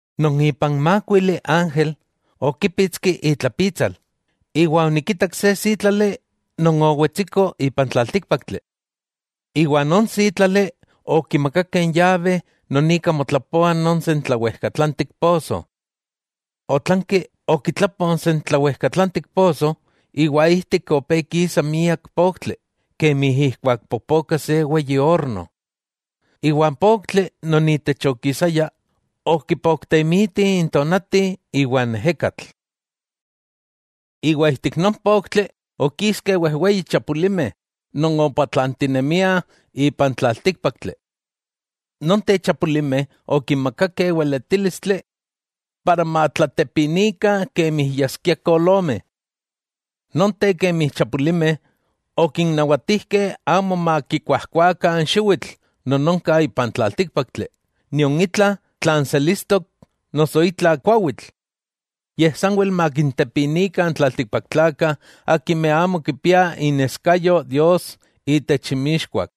Non ipan mákuili ángel okípitski itlapitsal, iwa onikitak se sítlali non owetsiko ipan tlaltíkpaktli. Iwa non sítlali okimakakeh n yabe non ika motlapoa non sentlawejkatlantik poso. Otlanki okitlapo n sentlawejkatlantik poso, iwa ijtik opé kisa miak poktli kemi ijkuak popoka se weyi orno. Iwa n poktli non itech okisaya, okipoktemiti n tonati iwa n ejekatl. Iwa ijtik non poktli okiskeh wejweyi chapulimeh non opatlantinemiah ipan tlaltíkpaktli. Nonteh chapulimeh okinmakakeh weletílistli para matlatepinikah kemi yaskiah kolomeh. Nonteh kemi chapulimeh, okinnawatijkeh amo makikuajkuakah n xiwitl non onka ipan tlaltíkpaktli, nion itla tlan selistok noso itla kuawitl, yej sanwel makintepinikah n tlaltikpaktlakah akimeh amo kipiah ixneskayo Dios itech inmixkuak.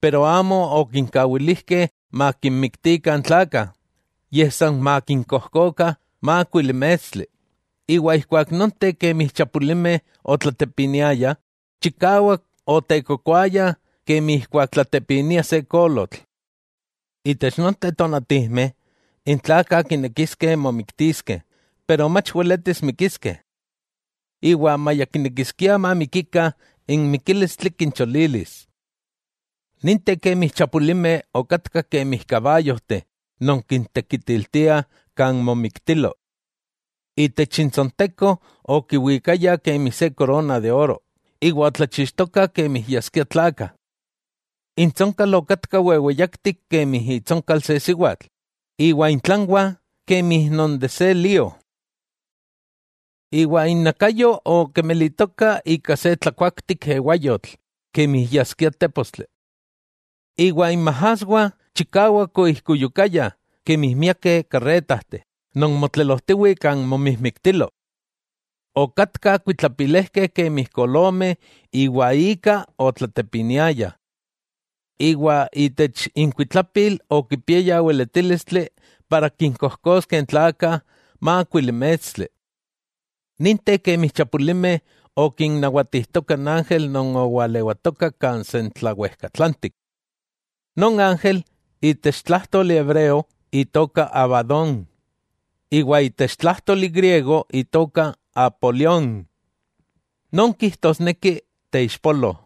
Pero amo okinkawilijkeh makinmiktikah n tlakah, yej san makinkojkokah mákuili mestli; iwa ijkuak nonteh kemi chapulimeh otlatepiniayah, chikawak otekokoaya kemi ijkuak tlatepinia se kolotl. Itech nonteh tonatijmeh, n tlakah kinekiskeh momiktiskeh pero mach weletis mikiskeh. Iwa maya kinekiskiah mamikikah, n mikílistli kincholilis. Ninteh kemi chapulimeh okatkah kemi kabayojteh non kintekitiltiah kan momijmiktilo. Itech intsonteko okiwikayah kemi se korona de oro, iwa otlachixtokah kemi yaskiah tlakah. Intsonkal okatka weweyaktik kemi itsonkal se siwatl, iwa intlanwah kemi se lío. Iwa innakayo okemelitoka ika se tlakuaktik ewayotl kemi yaskia tépostli. Iwa inmajaswah chikawak oijkuyukayah, kemi miakeh karretajteh non motlelojtiwih kan momijmiktilo. Okatkah kuitlapilejkeh kemi kolomeh iwa ika otlatepiniayah. Iwa itech inkuitlapil okipiayah weletílistli para kinkojkoskeh n tlakah mákuili mestli. Ninteh kemi chapulimeh okinnawatijtoka n ángel non owalewatoka kan sentlawejkatlantik. Non ángel itech tlájtoli hebreo itoka Abadón, iwa itech tlájtoli griego itoka Apolión, non kijtosneki: Teixpolo.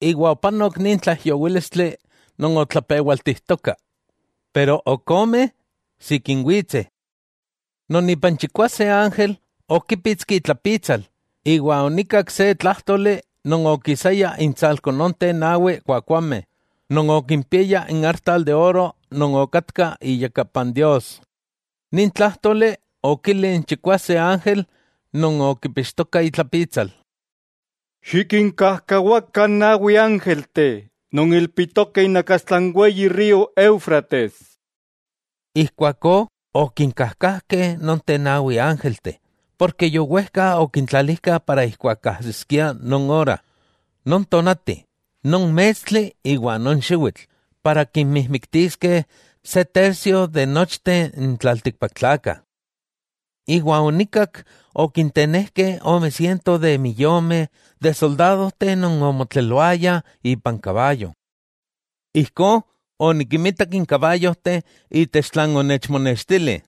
Iwa opanok nin tlaijyowílistli non otlapewaltijtoka. Pero ok ome sikin witseh. Non ipan chikwase ángel okípitski itlapitsal, iwa onikak se tlájtoli non okisaya intsalko nonteh nawi kuakuameh non okimpiaya n artal de oro non okatka iyakapan Dios. Nin tlájtoli okili n chikwase ángel non okipixtoka itlapitsal: —Xikinkajkawa n nawi ángelteh non ilpitokeh inakastla n weyi río Éufrates. Ijkuakó okinkajkajkeh nonteh nawi ángelteh, porke yowejka okintlalijkah para ijkuak ajsiskia non ora, non tonati, non mestli iwa non xiwitl para kinmijmiktiskeh se tercio de nochteh n tlaltikpaktlakah. Iwa onikak okintenejkeh ome siento miyomeh soldadojteh non omotleloayah ipan kabayo. Ijkó onikinmitak n kabayojteh itech tlan onechmonextili.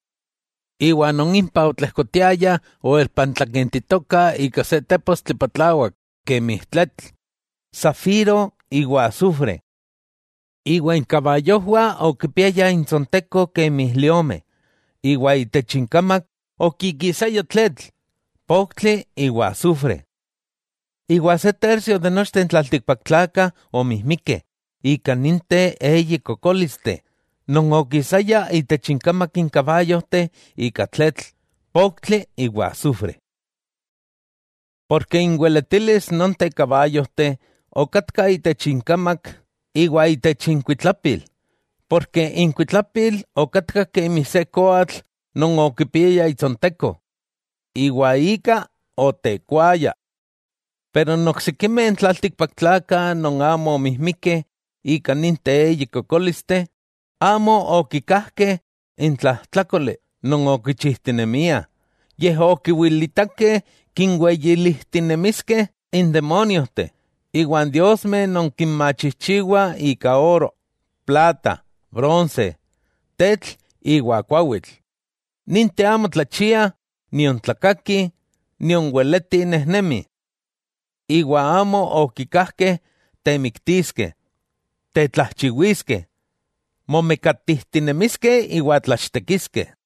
Iwa non impah otlejkotiayah oelpantlakentitokah ika se tépostli patlawak kemi tletl, safiro iwa asufre. Iwa inkabayojwah okipiayah intsonteko kemi liomeh, iwa itech inkamak okikisaya tletl, poktli iwa asufre. Iwa se tercio nochteh n tlaltikpaktlakah omijmikeh ika ninteh eyi kokólisteh non okisayah itech inkamak n kabayojteh ika tletl, poktli iwa asufre. Inweletilis nonteh kabayojteh okatka itech inkamak iwa itech inkuitlapil; porke inkuitlapil okatka kemi se koatl non okipiaya itsonteko, iwa ika otekuayah. Pero n oksikimeh tlaltikpaktlakah non amo omijmikeh ika ninteh eyi kokólisteh, amo okikajkeh n tlajtlákoli non okichijtinemiah; yej okiwilitakeh kinweyilijtinemiskeh n demóniojteh iwa n diosmeh non kinmachijchiwah ika oro, plata, bronse, tetl iwa kuawitl, ninteh amo tlachiah, nion tlakakih, nion weletih nejnemih. Iwa amo okikajkeh temiktiskeh, tetlajchiwiskeh, momekatijtinemiskeh iwa tlachtekiskeh.